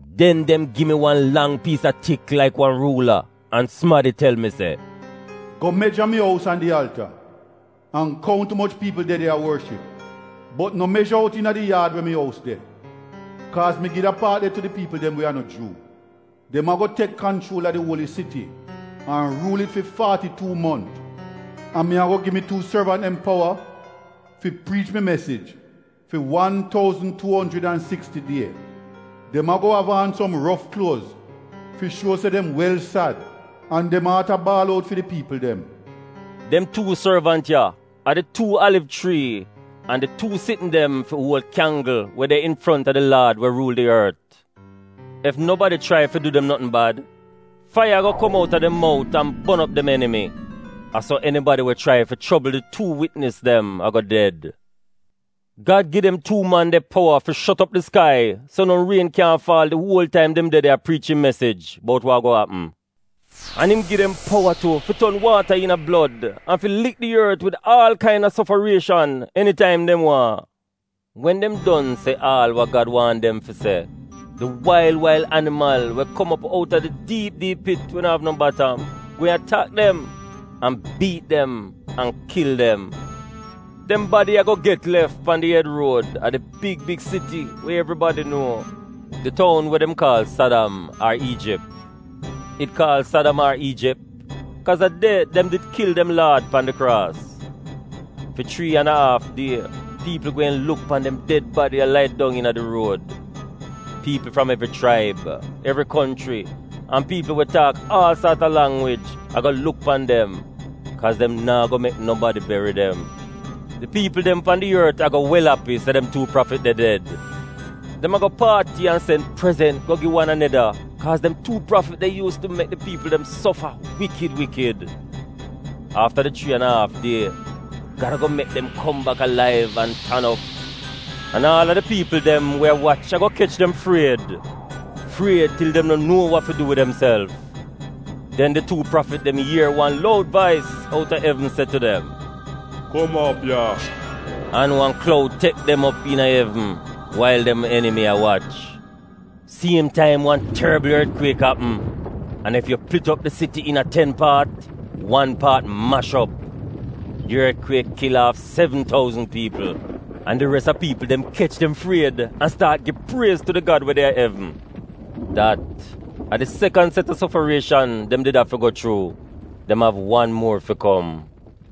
Den dem gi mi wan lang piis a tik laik wan ruula an Gad tel mi se, “Go meja mi ous an di alta, an kount umoch piipl de de a worship. Bot no meja out iina di yaad we mi ous de, kaaz mi gi da paat de tu di piipl dem we a no Juu. Dem ago tek kanchuol a di uoli siti an ruul it fi faati-tuu mont. An mi ago gi mi tuu sorvant dem powa fi priich mi mesij fi wan touzn, tuu onjrid an siksti die. Dem ago av aan som rof kluoz fi shuo se dem wel sad an dem aat a baal out fi di piipl dem.” Dem tuu sorvant ya a di tuu aliv chrii an di tuu sitn dem fi uol kyanggl we de infronta di Laad we ruul di ort. Ef nobadi chrai fi du dem notn bad, faiya ago kom outa dem mout an bon op dem enimi. A so enibadi we chrai fi chobl di tuu witnis dem ago ded. Gad gi dem tuu man de powa fi shot op di skai so no rien kyaahn faal di uol taim dem de de a priich im mesij bout wa ago apm. An im gi dem powa tu fi ton waata iina blod an fi lik di ort wid aal kaina sofarieshan enitaim dem waahn. Wen dem don se aal wa Gad waahn dem fi se, di wail wail animal we kom op outa di diip diip pit we no av no batam gweehn atak dem, an biit dem an kil dem. Dem badi ago get lef pan di ed ruod a di big big siti we evribadi nuo, di toun we dem kaal Sadam ar Iijip. Dem kaal Sadam ar Iijip kaaz a de dem did kil dem Laad pan di kraas. Fi chrii an a aaf die piipl gweehn luk pan dem ded badi a lai dong iina di ruod. Piipl fram evri chraib, evri konchri an piipl we taak aal saat a langwij ago luk pan dem, kaaz dem naa go mek nobadi beri dem. Di piipl dem pan di ort ago wel api se dem tuu prafit de ded. Dem ago paati an sen prezent go gi wan aneda kaaz dem tuu prafit de yuuz tu mek di piipl dem sofa wikid wikid. Afta di chrii an a aaf die, Gad ago mek dem kom bak alaiv an tan op. An aal a di piipl dem we a wach ago kech dem fried — fried til dem no nuo wa fi du wid demself. Den di tuu prafit dem ier wan loud vais outa evn se tu dem, “Kum op ya.” An wan kloud tek dem op iina evn wail dem enimi a wach. Siem taim wan torbl ortkwiek apm an ef yu plit op di siti iina ten paat, wan paat mash op. Di ortkwiek kil aaf sevn touzn piipl. An di res a piipl dem kech dem fried an staat gi priez tu di Gad we de a evn. Dat a di sekan set a sofarieshan dem did afi go chuu. Dem av wan muor fi kom.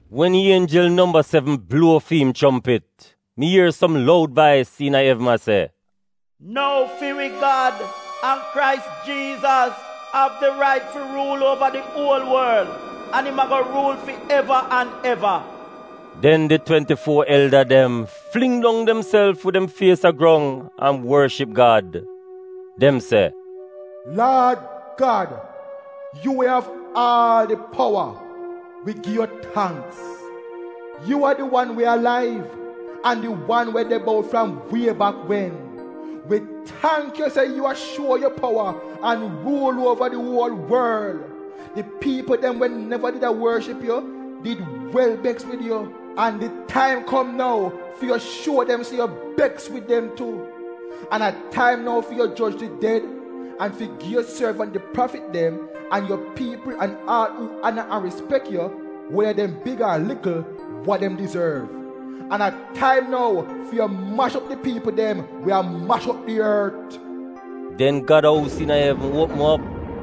Wen ienjel nomba sevn bluo fi im chompit, mi ier som loud vais iina evn a se, “Nou fi wi Gad, an Krais Jiizas av di rait fi ruul uova di uol worl an im ago ruul fi eva an eva.” Den di twenti-fuo elda dem fling dong demself wid dem fies a grong an worship Gad. Dem se: “Laad Gad, yu we av aal di powa, wi gi yu tangks. Yu a di wan we alaiv, an di wan we de bout fram wie bak wen. Wi tangk yu se yu a shuo yu powa an ruul uova di uol worl. Di piipl dem we neva did a worship yu did wel beks wid yu; an di taim kom nou fi yu shuo dem se yu beks wid dem tu. An a taim nou fi yu joj di ded, an fi gi yu sorvant di prafit dem, an yu piipl an aal uu ana an rispek yu, weda dem big ar likl, wa dem dizorv. An a taim nou fi yu mash op di piipl dem we a mash op di ort.” Den Gad ous iina evn uopm op.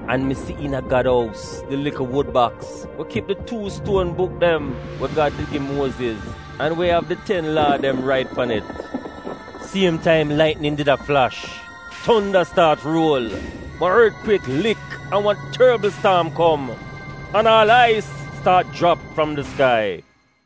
An mi si iina Gad ous di likl wud baks we kip di tuu stuon buk dem we Gad di gi Muoziz an we av di ten komaanment rait pan it. Siem taim laitnin did a flash, tonda staat ruol, wan ortkwiek lik an wan torbl staam kom, an aal ais staat jrap fram di skai.